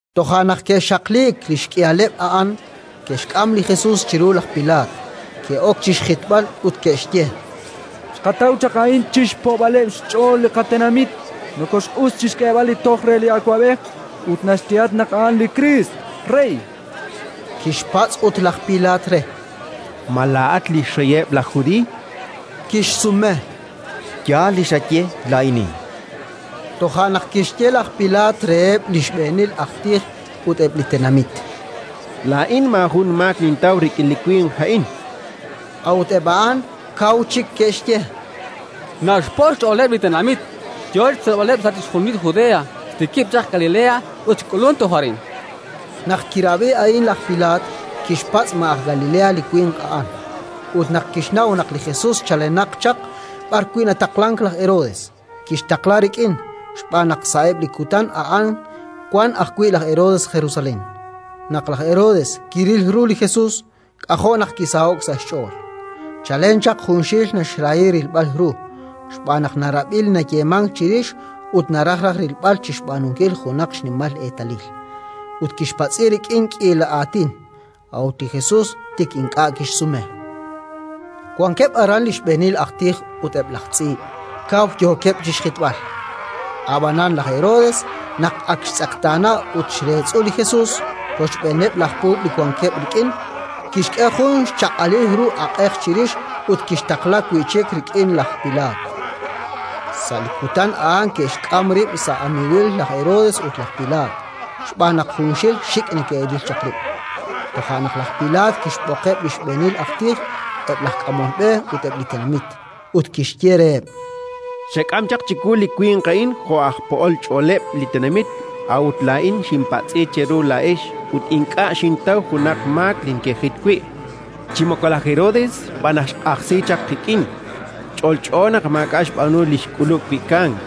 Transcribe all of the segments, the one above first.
Toja' naq ke'xaqliik li xk'ihaleb' a'an, ke'xk'am li Jesus chiru laj Pilaat, ke'ok chi xjitb'al ut ke'xye: —Xqataw chaq a'in chi xpo'b'aleb' xch'ool li qatenamit. Nokooxq'us chi xk'eeb'al li toj re li awab'ej ut naxyehatq naq a'an li Kriist Rey. Kixpatz' ut laj Pilaat re: —Ma laa'at li xreyeb' laj Judiiy? Kixsume: —Yaal li xaye: laa'inin. Toja' naq kixye laj Pilaat reheb' li xb'eenil aj tij ut eb' li tenamit: —Laa'in maajun maak nintaw rik'in li winq a'in. A'ut eb' a'an kaw chik ke'xye: —Naxpo' xch'ooleb' li tenamit, yo chi xtzolb'aleb' sa' chixjunil Judea: xtikib' chaq Galilea ut xk'ulunk toj arin. Naq kirab'i a'in laj Pilaat, kixpatz' ma aj Galilea li winq a'an; ut naq kixnaw naq li Jesus chalenaq chaq b'arwi' nataqlank laj Herodes, kixtaqla rik'in, xb'aan naq sa'eb' li kutan a'an wank ajwi' laj Herodes Jerusalén. Naq laj Herodes kiril ru li Jesus, k'ajo' naq kisaho'k sa' xch'ool: chalen chaq junxil naxrahi rilb'al ru, xb'aan naq narab'i li nayeemank chirix ut naraj raj rilb'al chi xb'aanunkil junaq xnimal eetalil. Ut kixpatz'i rik'in k'iila aatin, a'ut li Jesus tik ink'a' kixsume. Wankeb' aran li xb'eenil aj tij ut eb' laj tz'iib', kaw yookeb' chi xjitb'al. Ab'anan laj Herodes naq ak xtz'eqtaana ut xreetz'u li Jesus, rochb'eeneb' laj puub' li wankeb' rik'in, kixk'e jun xchaq'alil ru aq'ej chirix ut kixtaqla wi' chik rik'in laj Pilaat. Sa' li kutan a'an ke'xk'am rib' sa' amiiwil laj Herodes ut laj Pilaat, xb'aan naq junxil xik' neke'ril chaq rib'. Toja' naq laj Pilaat kixb'oqeb' li xb'eenil aj tij, eb' laj k'amol b'e ut eb' li tenamit, ut kixye reheb': —Xek'am chaq chiwu li winq a'in jo' aj po'ol xch'ooleb' li tenamit; a'ut laa'in xinpatz'i cheru laa'ex ut ink'a' xintaw junaq xmaak li nekejit wi'. Chi moko laj Herodes, xb'aan naq xq'ajsi chaq qik'in. Ch'olch'o naq maak'a' xb'aanu li xk'ulub' wi' kamk.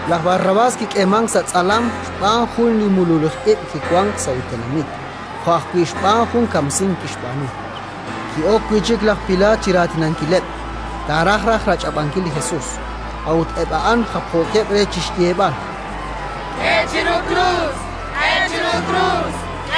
Laj Barrabás kik'eemank sa' tz'alam xb'aan jun li mululij ib' kiwank sa' li tenamit jo' ajwi' xb'aan jun kamsink kixb'aanu. Ki'ok wi' chik laj Pilaat chi raatinankileb', taaraj raj rach'ab'ankil li Jesus; a'ut eb' a'an japjookeb' re chi xyeeb'al: —K'e chiru krus, k'e chiru krus!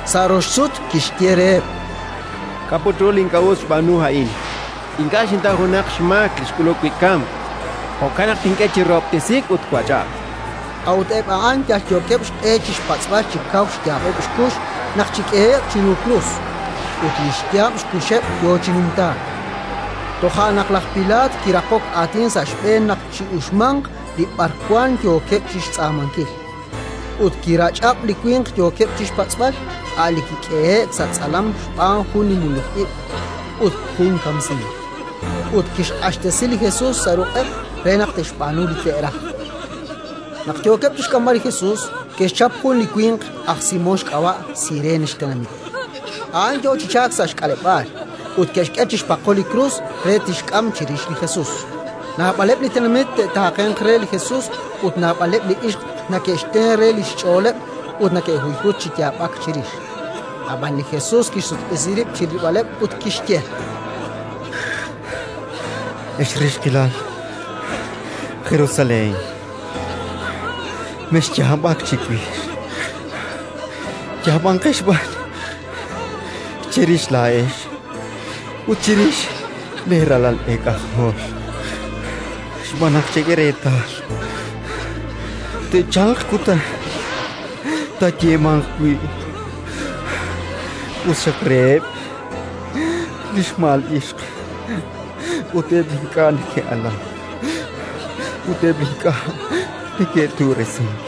Sa' rox sut kixye reheb': —K'a' put ru li ink'a' us xb'aanu a'in? Ink'a' xintaw junaq xmaak li xk'ulub' wi' kamk. Jo'kan naq tink'e chi rahob'tesiik ut twach'ab'. A'ut eb' a'an yalyookeb' xq'e chi xpatz'b'al chi kaw xyaab'eb' xkux naq chik'ehe'q chiru krus, ut li xyaab' xkuxeb' yo chi numtaak. Toja' naq laj Pilaat kiraqok aatin sa' xb'een naq chi'uxmanq li b'arwan yookeb' chi xtz'aamankil. Ut kirach'ab' li winq yookeb' chi xpatz'b'al, a' li kik'ehe'k sa' tz'alam xb'aan jun li mululij ib' ut jun kamsink, ut kixq'axtesi li Jesus sa' ruq'eb' re naq te'xb'aanu li te'raj. Naq yookeb' chi xk'amb'al li Jesus, ke'xchap jun li winq, aj Simón xk'ab'a', Sirene xtenamit. A'an yo chi chalk sa' xk'aleb'aal, ut ke'xk'e chixpaqo li krus re tixk'am chirix li Jesus. Naab'aleb' li tenamit te'taaqenq re li Jesus ut naab'aleb' li ixq neke'xten re li xch'ooleb' ut neke'huyhutk chi yaab'ak chirix. Ab'an li Jesus kixsutq'isi rib' chi rilb'aleb' ut kixye: —Ex rixqilal Jerusalén, mexyaab'ak chiwix, yaab'anqex b'an cherix laa'ex ut chirix leeralal eek'ajol. Xb'aan naq, chek'e reetal, te'chalq kutan taayeemanq wi': «Us xaq reheb' li xma'al ixq ut eb' li ink'a' ke'alank, ut eb' li ink'a' ke'tu'resink!».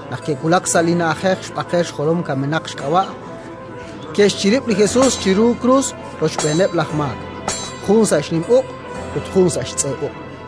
Naq ke'wulak sa' li na'ajej xB'aqel-xjolom-kamenaq xk'ab'a', ke'xchirib' li Jesus chiru krus rochb'eeneb' laj maak: jun sa' xnim uq' ut jun sa' xtz'e uq'.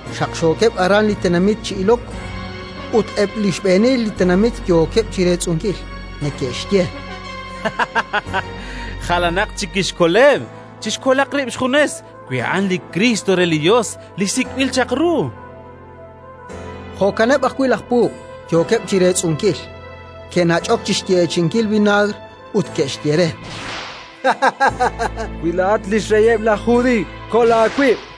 Xaqxookeb' aran li tenamit chi ilok. Ut eb' li xb'eenil li tenamit yookeb' chi reetz'unkil, neke'xye: —Jalanatq chik kixkoleb'; chixkolaq rib' xjunes, wi a'an li Kriist re li Yos, li Sik'b'il chaq ru. Jo'kaneb' ajwi' laj puub', yookeb' chi reetz'unkil. Ke'nach'ok chi xyeechi'inkil vinaagr ut ke'xye re: —Wi laa'at li xreyeb' laj Judiiy, kol aawib'!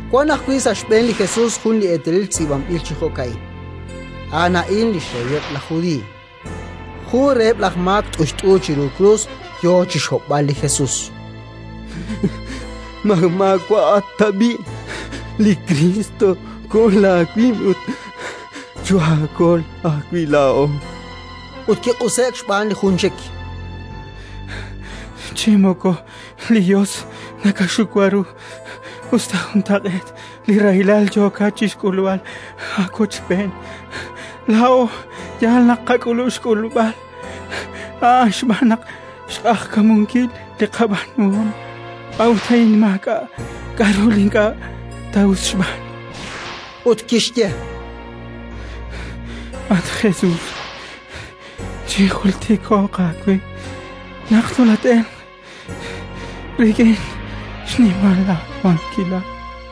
Wank ajwi' sa' xb'een li Jesus jun li eetalil tz'iib'anb'il chi jo'ka'in: “A'an a'in li xReyeb' laj Judiiy”. Jun reheb' laj maak t'uyt'u chiru krus yo chi xhob'b'al li Jesus: —Ma maawa'at tab'i' li Kriist? Kol aawib' ut choohaakol ajwi' laa'o, chan re. Ut kiq'use'k xb'aan li jun chik: —Chi moko li Yos nakaxiwa ru, us ta juntaq'eet li rahilal yookat chi xk'ulb'al aawochb'een? Laa'o yaal naq qak'ulub' xk'ulb'al a'an xb'aan naq xq'ajkamunkil li qab'aanuhom, a'ut a'in maak'a' k'aru li ink'a' ta us xb'aanu. Ut kixye: —At Jesus, chinjultiko'q aawe naq tolat-elq rik'in xnimal aawankilal.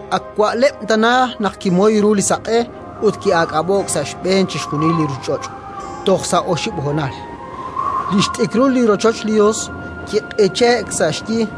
Ak wa'leb' tana naq kimoy ru li saq'e ut ki'aak'ab'o'k sa' xb'een chixjunil li ruuchich'och' toj sa' oxib' honal. Li xt'ikrul li rochoch li Yos kiq'iche'k sa' xyi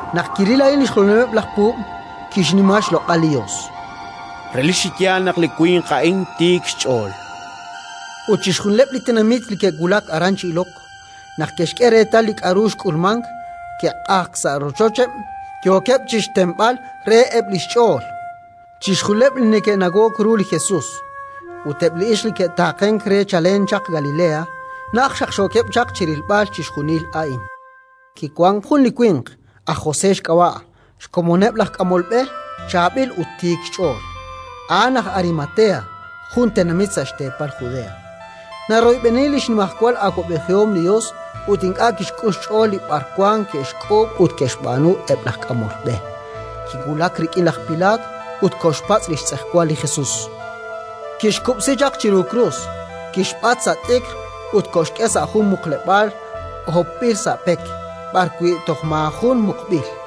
Naq kiril a'in li xjolomileb' laj puub', kixnima xloq'al li Yos: —Relik chi yaal naq li winq a'in tiik xch'ool, chan. Ut chixjunileb' li tenamit li ke'wulak aran chi ilok, naq ke'xk'e reetal li k'aru xk'ulmank, ke'q'ajk sa' rochocheb', yookeb' chi xtenb'al re eb' li xch'ool. Chixjunileb' li neke'nawok ru li Jesus ut eb' li ixq li ke'taaqenk re chalen chaq Galilea, najt xaqxookeb' chaq chi rilb'al chixjunil a'in. Kiwank jun li winq, aj José xk'ab'a', xkomoneb' laj k'amol b'e, chaab'il ut tiik xch'ool. A'an aj Arimatea, jun tenamit sa' xteepal Judea. Naroyb'eni li xnimajwal awab'ejihom li Yos ut ink'a' kixk'ul xch'ool li b'arwan ke'xk'uub' ut ke'xb'aanu eb' laj k'amol b'e. Kiwulak rik'in laj Pilaat ut koxpatz' li xtz'ejwal li Jesus. Kixkub'si chaq chiru krus, kixb'at sa' t'ikr ut koxk'e sa' jun muqleb'aal hopb'il sa' pek, b'arwi' toj maajun muqb'il.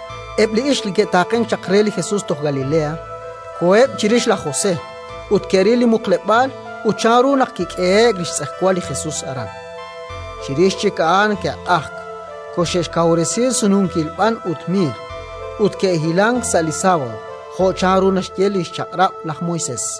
Eb' li ixq li ke'taaqenk chaq re li Jesus toj Galilea, koheb' chirix laj José ut ke'ril li muqleb'aal ut chanru naq kik'ehe'k li xtz'ejwal li Jesus aran. Chirix chik a'an ke'q'ajk, koxe'xkawresi sununkil b'an ut miir, ut ke'hilank sa' li sábado, jo' chanru naxye li xChaq'rab' laj Moisés.